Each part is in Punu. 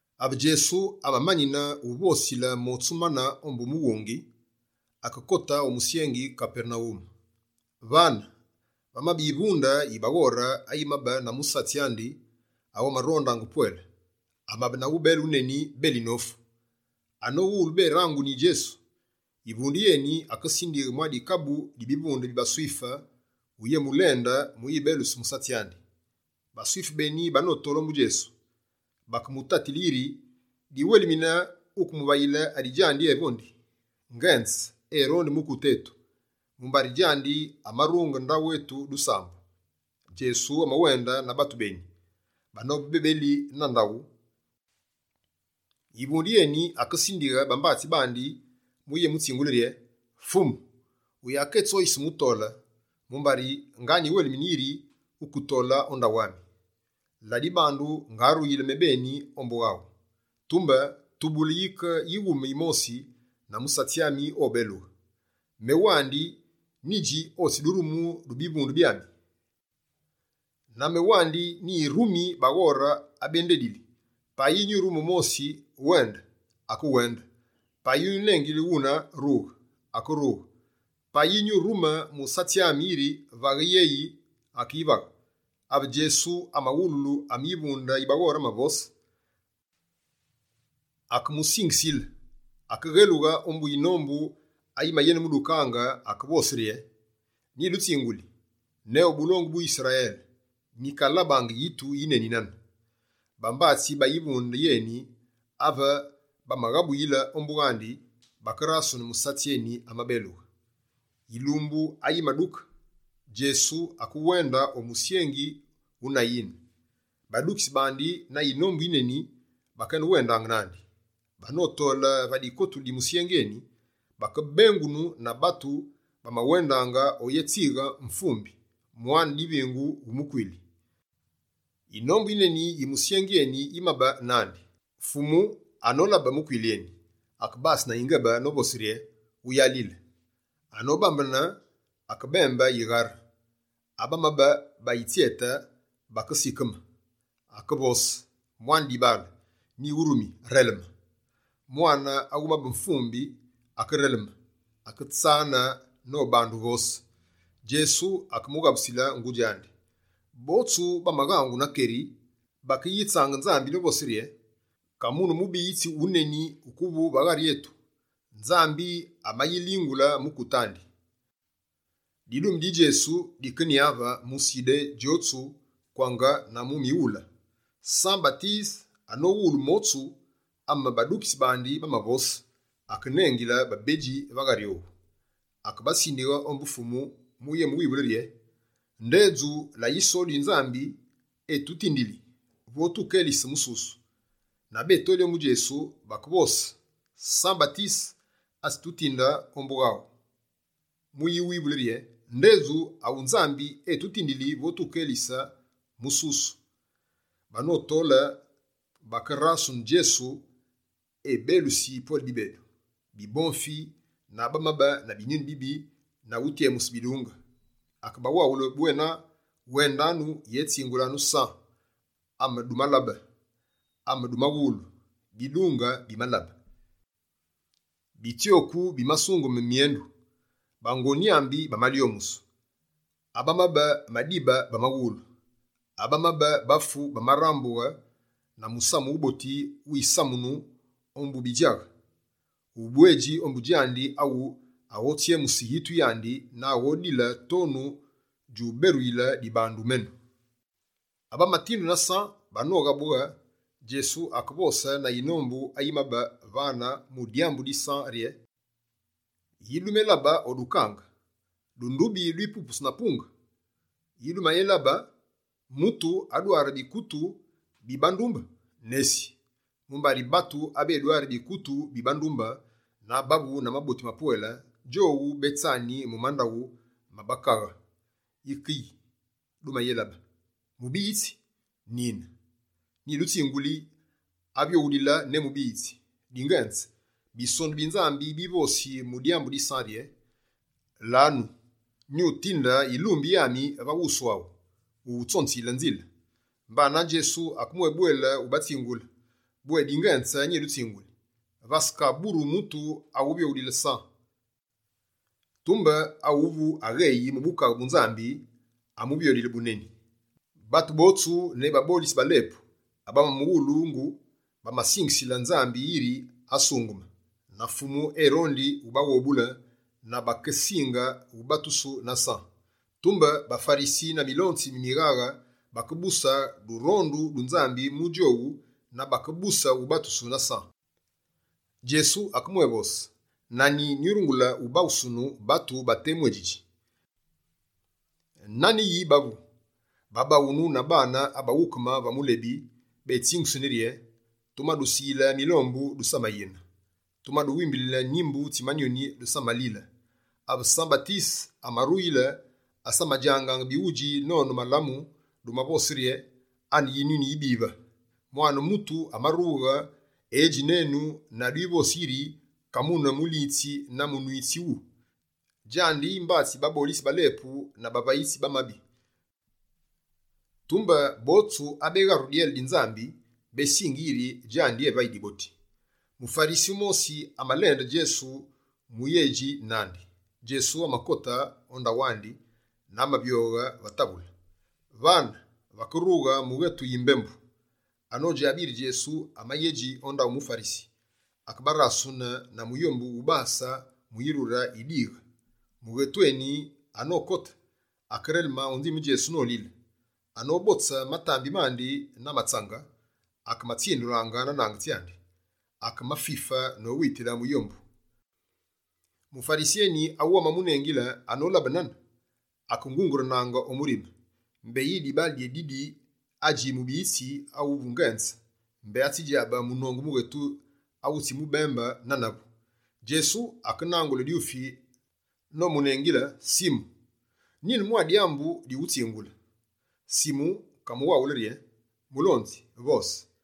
Ave Djesu amamani wuvosile motsu mane ombu mughungi, akekote o musyengi Kapernawume. Vane, vamabe yivunde yi baghore ayimabe na musatsi andi awu amarondaange pwele. Amabe na ubele wuneni beli nofu. Anowulu beranguni Djesu, yivunde yeni akesindighe mwa dikabu di bivunde bi baSwife uyémulende mu uyibeluse musatsi andi. BaSwife beni banotole ombu Djesu, bakemutatile yiri: «Diwelimine wukemuvayile adi djandi evondi. Ngenze erondi mukute etu, mumbari djandi amarunge ndaghu etu dusambu.» Djesu amawende na batu beni. Banobe bebeli na ndaghu, yivunde yeni akesindighe bambatsi bandi mu uyémutsingule rye: «Fumu, wuyaketsoyise mu utole, mumbari nga nyiwelimine yiri wukekote o ndaghu ami. Ladibandu, ngaruyile mebeni ombu waghu. Tumbe tubule yike yighume yimosi na musatsi ami obelughe. Mewandi, nyidji otsi durumu du bivunde byami, na mewandi nyirumi baghore abendedili. Payi nyurume wumosi: “Wende!” Akewende. Payi nyunengile wune: “Rughe!” Akerughe. Payi nyurume musatsi ami, yiri “Vaghe yeyi!” Akeyivaghe.» Ave Djesu amawululu ame yivunde yi baghore amavose, akemusingisile, akeghelughe ombu yinombu ayimayenemudukaange. Akevose rye: «Nyidutsinguli: ne o bulongu bu Yisrayele, nyikalabaange yitu yineni nane.» Bambatsi ba yivunde yeni, ave bamaghabuyile ombu wandi, bakerasune musatsi eni amabelughe. Yilumbu ayimaduke, Djesu akewende o musyengi wu Nayine. Badukitsi bandi na yinombu yineni bakenewendaange nandi. Banotole va dikotulu di musyengi eni, bakebengunu na batu bamawendaange oyetswighe mvumbi, mwane divingu wu mukwili. Yinombu yineni yi musyengi eni yimabe nandi. Fumu, anolabe mukwili eni, akebase na yingebe novose rye: «Wuyalile.» Anobambene, akebembe yighare. Abamabe bayitsyete, bakesikeme. Akevose: «Mwane dibaale nyiwurumi, releme!» Mwane awumabe wufu, akereleme, aketsane nobande uvose. Djesu akemughabusile ngudji andi. Botsu bamaghangu na keri. Bakeyitsaange Nzambi novose rye: «Ka mune mubiyitsi wuneni wukuvu va ghari etu! Nzambi amayilingule mukute andi.» Didume di Djesu dikenyave mu Sudé djotsu kwange na mu mighule. San-Batise anowulu motsu ame badukitsi bandi bamavose, akenengile babedji va ghari owu. Akebasindighe ombu Fumu mu yemuwivule rye: «Ndedju la Yisolu yi Nzambi etutindili vo tukelise mususu?» Na betoli ombu Djesu, bakevose: «San-Batise atsitutinde ombu awu mu uwivule rye: “Ndedju awu Nzambi etutindili vo tukelise mutu ususu?”» Banotole, bakerasune Djesu ebelusi pwele bibedu, bibomfi na abamabe na binyuni bibi na utyemuse bidunge. Akebawaghule bwena, wendanu, yétsingulanu San amedumalabe, amedumawulu: «Bidunge bimalabe, bitsyoku bimasungeme mwendu, bango nyámbi bamalyomusu, abamabe madibe bamawulu, abamabe bafu bamarambughe na musamu wuboti wumasamunu ombu bidjaghe. Ubwedji ombu djandi awu aghotsyemuse yitu yandi na aghodile tonu djuberuyile dibandu menu.» Abamatindu na San banoghabughe, Djesu akevose na yinombu ayimabe vane mu dyambu di San rye: «Yi dumelabe o dukange? Dundubi dwipupusu na mupunge? Yi dumayelabe? Mutu adware bikutu bi bandumbe? Nesi! Mumbari batu abedwari bikutu bi bandumbe na abavu na maboti mapwele, djowu betsani mu mandaghu ma bakaghe. Yike yi, dumayelabe? Mubiyitsi? Nine nyidutsinguli avyoghulile ne mubiyitsi! Dingenze, Bisonu bi Nzambi bivosi mu dyambu di San rye: “Lanu, nyutinde yilumbi yami va wusu aghu, mu uwutsonziyile nzile.”» Mbana Djesu akemwébwele ubatsingule: «Bwé dingenze nyidutsinguli, vasekaburu mutu awuvyoghulile San. Tumbe, awu agheyi mu Bukaghe bu Nzambi, amuvyoghe buneni. Batu botsu, ne babolitsi ba lepu abamamuwulu, bamasingisile Nzambi yiri asungeme na Fumu erondi ubaghobule na bakesinge ubatusu na San. Tumbe baFarisi na milonzi mi mighaghe bakebuse durondu du Nzambi mu djowu na bakebuse ubatusu na San.» Djesu akebwévose: «Na anyi nyurungule ubaghusunu batu ba temu adjidji? Nane yi bavu? Ba baghunu na baane abaghukume va mulebi, betsingusini rye: “Tumadusiyile milombu, dusamayine. Tumaduwimbilile nimbu tsi manyoni, dusamalile.” Ave San-Batise amaruyile, asamadjangaange bighudji nonu malamu, dumavose rye: “Ane Yinyuni yibive.” Mwane Mutu amarughe, edji nenu na dwivosi yiri Kamune mulitsi na munwitsi wu, djandi mbatsi babolitsi ba lepu na bavayitsi ba mabi. Tumbe botsu abegharu dyele di Nzambi, besingi yiri djandi evayi diboti.» Mufarisi wumosi amalende Djesu mu uyédji nandi. Djesu amakote o ndaghu andi na amavyoghe va metse. Vane, vakerughe mughetu yimbembu. Anodjabe yiri Djesu amayedji o ndaghu muFarisi, akebarasune na muyombu wubase mu yirure yi dighe. Mughetu eni anokote, akereleme o nzime Djesu nolile. Anobotse matambi mandi na matsange, akematsindulaange na nange tsyandi. Akemafife nowitile muyombu. Mufarisi eni awu amamunengile, anolabe nane, akengungurunaange o murime: «Mbeyi dibaale dyeni didi adji mubiyitsi awungenze, mbé atsidjabe munongu mughetu awutsimubembe nane avu.» Djesu akenangule dyufi nomunengile: «Simu, nyine mwa dyambu dyughutsingule.» Simu kamuwaghule rye: «Mulonzi, vose.»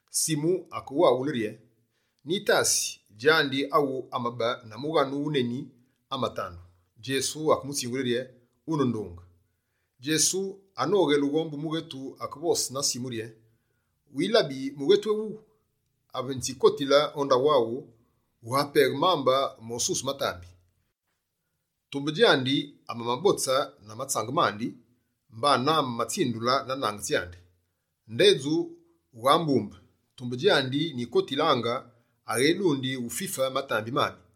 Simu akewaghule rye: «Nyitasi, djandi awu amabe na mughanu wuneni amatandu.» Djesu akemutsingule rye: «Wune ndunge.» Djesu anoghelughe ombu mughetu, akevose na Simu rye: «Wilabi mughetu ewuwu? Ave nyitsikotile o ndaghu aghu, wughapeghe mambe mosuse matambi. Tumbe djandi, amamabotse na matsange mandi, mbanane, amamatsindule na nange tsyandi. Ndedju wughambumbe. Tumbe djandi nyikotilaange, aghedundi ufife matambi mami.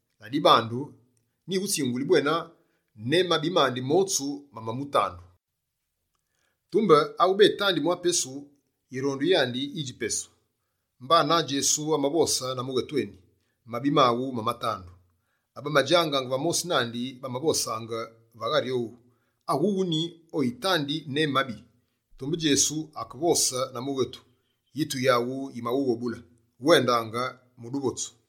Ladibandu, nyighutsinguli bwena ne mabi mandi motsu mamamutandu, mumbari yirondu yandi yineni. Tumbe awubetandi mwa pesu, yirondu yandi yidji pesu.» Mbanane Djesu amavose na mughetu eni: «Mabi maghu mamatandu.» Abamadjangaange va mosi nandi, bamavosaange va ghari owu: «Awuwu ni oyitandi ne mabi?» Tumbe Djesu akevose na mughetu: «Yitu yaghu yimaghughobule, wendange mu duvotsu.»